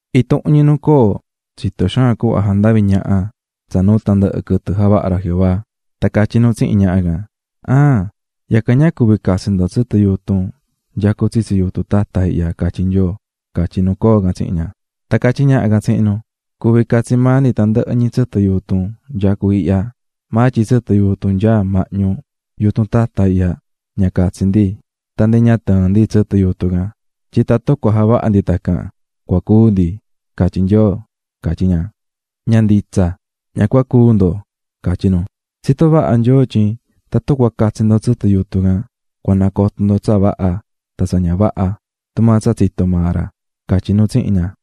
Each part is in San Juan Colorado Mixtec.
Intuhun ñi nu coo tsitó xaan cuhva jandaví ñaha nu, tsa nuu tandɨhɨ ca quɨtɨ javaha̱ Nyoo Jehová, tan catyí nu tsihin ñaha can: --¿Aan, yacan catyí Nyoo tyin ña cuví catsi ndo tsɨtɨ yutun nyacú tsitsi yutun tata ihya? --catyí nu coo can tsihin ña. Tan catyí ñaha can tsihin nu: --Cuví maa catsí ndi tandɨhɨ ñi tsɨtɨ yutun nyacú ihya, maa tyin tsɨtɨ yutun nyaá mahñu yutun tata ihya, ña cuví catsi ndi tan ndi ña cuví tɨɨn ndi tsɨtɨ tun, tyin tatun cua javaha ndi tacan cua cúu ndi, catyí Nyoo --catyí ña. --Ña nditsa, ña cua cúu ndo --catyí nu--. Tsitó vaha Nyoo tyin tatun cua catsi ndo tsɨtɨ yutun can cua coto ndo tsa vaha tan tsa ña vaha tumaa tsa tsitó maa ra --catyí nu tsihin ña.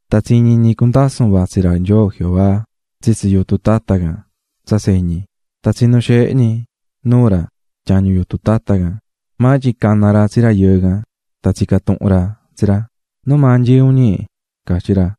Tan tsiñi̱ ñi cundasún yutun nu vatsí ra Nyoo Jehová tsitsi yutun tata can tsa tseñi. Tan tsinu̱ xeehe ñi nuu ra tyañu yutun tata can. Maa tyin cana̱ ra tsi rayɨɨ can, tan tsica̱ tuhun ra tsi ra: --¿Numaa nyií un, ñi? --catyí ra.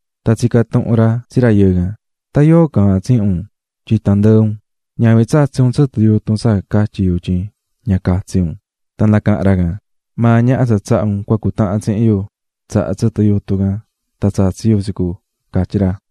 Tan tsica̱ tuhun ra tsi ra: --¿Tan yóo caahán tsihin un tyin tandɨɨ un? ¿A tsatsi̱ un tsɨtɨ yutun tsa catyi̱ yu tyin ña catsi un? Tan nacaha̱n ra: --Maa ñaha tsa tsaha̱ un cutahan tsihin yu tsaha̱ tsɨtɨ yutun can tsatsi̱ yu --catyí ra.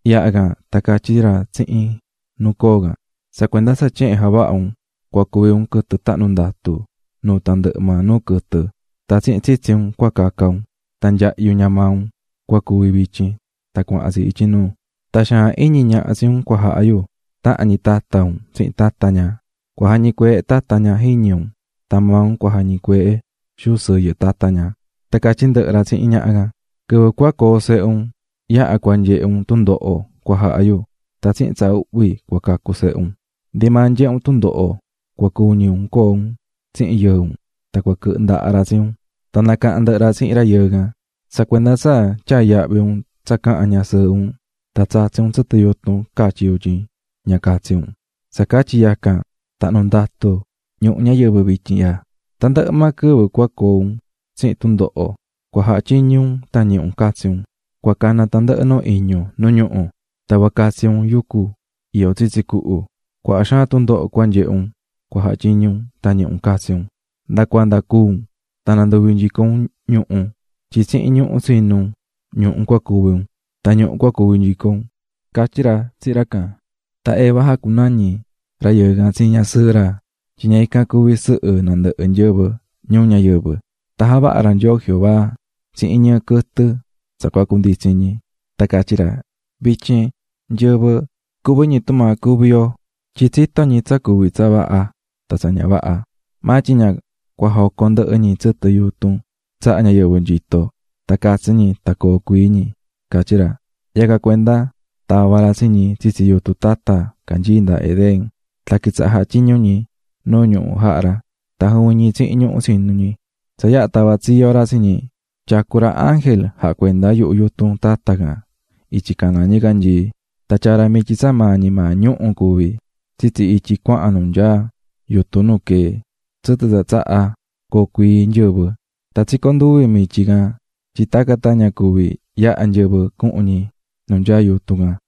Yaha can tan catyí ra tsihin nu coo can: --Tsa cuenda tsa tyehen javaha̱ un, cua cuvi un quɨtɨ tahnu̱ ndatu nuu tandɨhɨ maa nuu quɨtɨ, tan tsihin tsitsi un cua caca un, tan nyahyu ña maa un cua cuvi vityin tan cuahan tsi ityi nuu. Tan xaan iñi ñaha tsi un cua jaha yu tahan ñi tata un tsihin tata ña; cua jañicueehe tata ña jiñi un, tan maa un cua jañicueehe xuu sɨyɨ tata ña. Tan catyí ndɨhɨ ra tsihin ñaha can: --Quɨvɨ coo sehe un yaha cua nyehe un tundoho cua jaha yu; tan tsihin tsa uhvi cua cacu sehe un. Ndi maa nyehe un tundoho cua cuñi ca un coo un tsihin yɨɨ un, tan cua quɨhɨ ndaha ra tsi un. Tan nacaha̱n ndɨhɨ ra tsihin rayɨɨ can: --Tsa cuenda tsa tyaa̱ yahvi un tsa caha̱n ñasɨɨhɨ un, tan tsatsi̱ un tsɨtɨ yutun catyi̱ yu tyin ña catsi un, tsa catyi yacan, tahnu̱ ndatu ñuhu ñayɨvɨ vityin ihya. Tandɨhɨ maa quɨvɨ cua coo un tsihin tundoho cua jatyiñu un tan ñihi un catsi un. Cua cana tandɨhɨ nuu iñu nu ñuhu, tan cua catsi un yucu iyó tsitsi cuhu. Cuaha xaan tundoho cua nyehe un cua jatyiñu un tan ñihi un catsi un, nda cuanda cúu un, tan nanduvi nyico un ñuhu. Tyin tsihin ñuhu tsinu̱ un, ñuhu cuví un, tan ñuhu cua cuvi nyico un --catyí ra tsihin ra can. Tan Eva jacunañi̱ rayɨɨ can tsi ñasɨɨhɨ ra tyin ña ican cua cuvi sɨhɨ nandɨhɨ nyɨvɨ ñuu ñayɨvɨ. Tan javaha̱ ra Nyoo Jehová tsihin ñɨɨ quɨtɨ tsa cua cunditsi ñi. Tan catyí ra: "Vityin, nyɨvɨ cuví ñi tumaa cuví yo, tyin tsitó ñi tsa cuví tsa vaha tan tsa ña vaha. Maa tyin ña cua jocon ndɨhɨ ñi tsɨtɨ yutun tsahá ñayɨvɨ nyito tan catsi ñi tan coo cuii ñi", catyí ra. Yacan cuenda tava̱ ra tsi ñi tsitsi yutun tata canyií nda Edén, tan quitsaha̱ jatyiñu ñi nuu ñuhu jaha̱ ra tan juvin tsihin ñuhu tsinu̱ ñi. Tsa yaha tava̱ tsiyo ra tsi ñi, tyacu̱ ra ángel jacuendá yuhu yutun tata can ityi caná ñicanyii. Tan tyaa̱ ra mityi, tsa maa ñi maa ñuhu̱ cuví, tsitsi ityi cuahan nu nyaá yutun nu queé tsɨtɨ tsa tsahá coo cuii nyɨvɨ. Tan tsicó nduvi mityi can tyin tacan tan ña cuvi yaha nyɨvɨ cuhun ñi nu nyaá yutun can.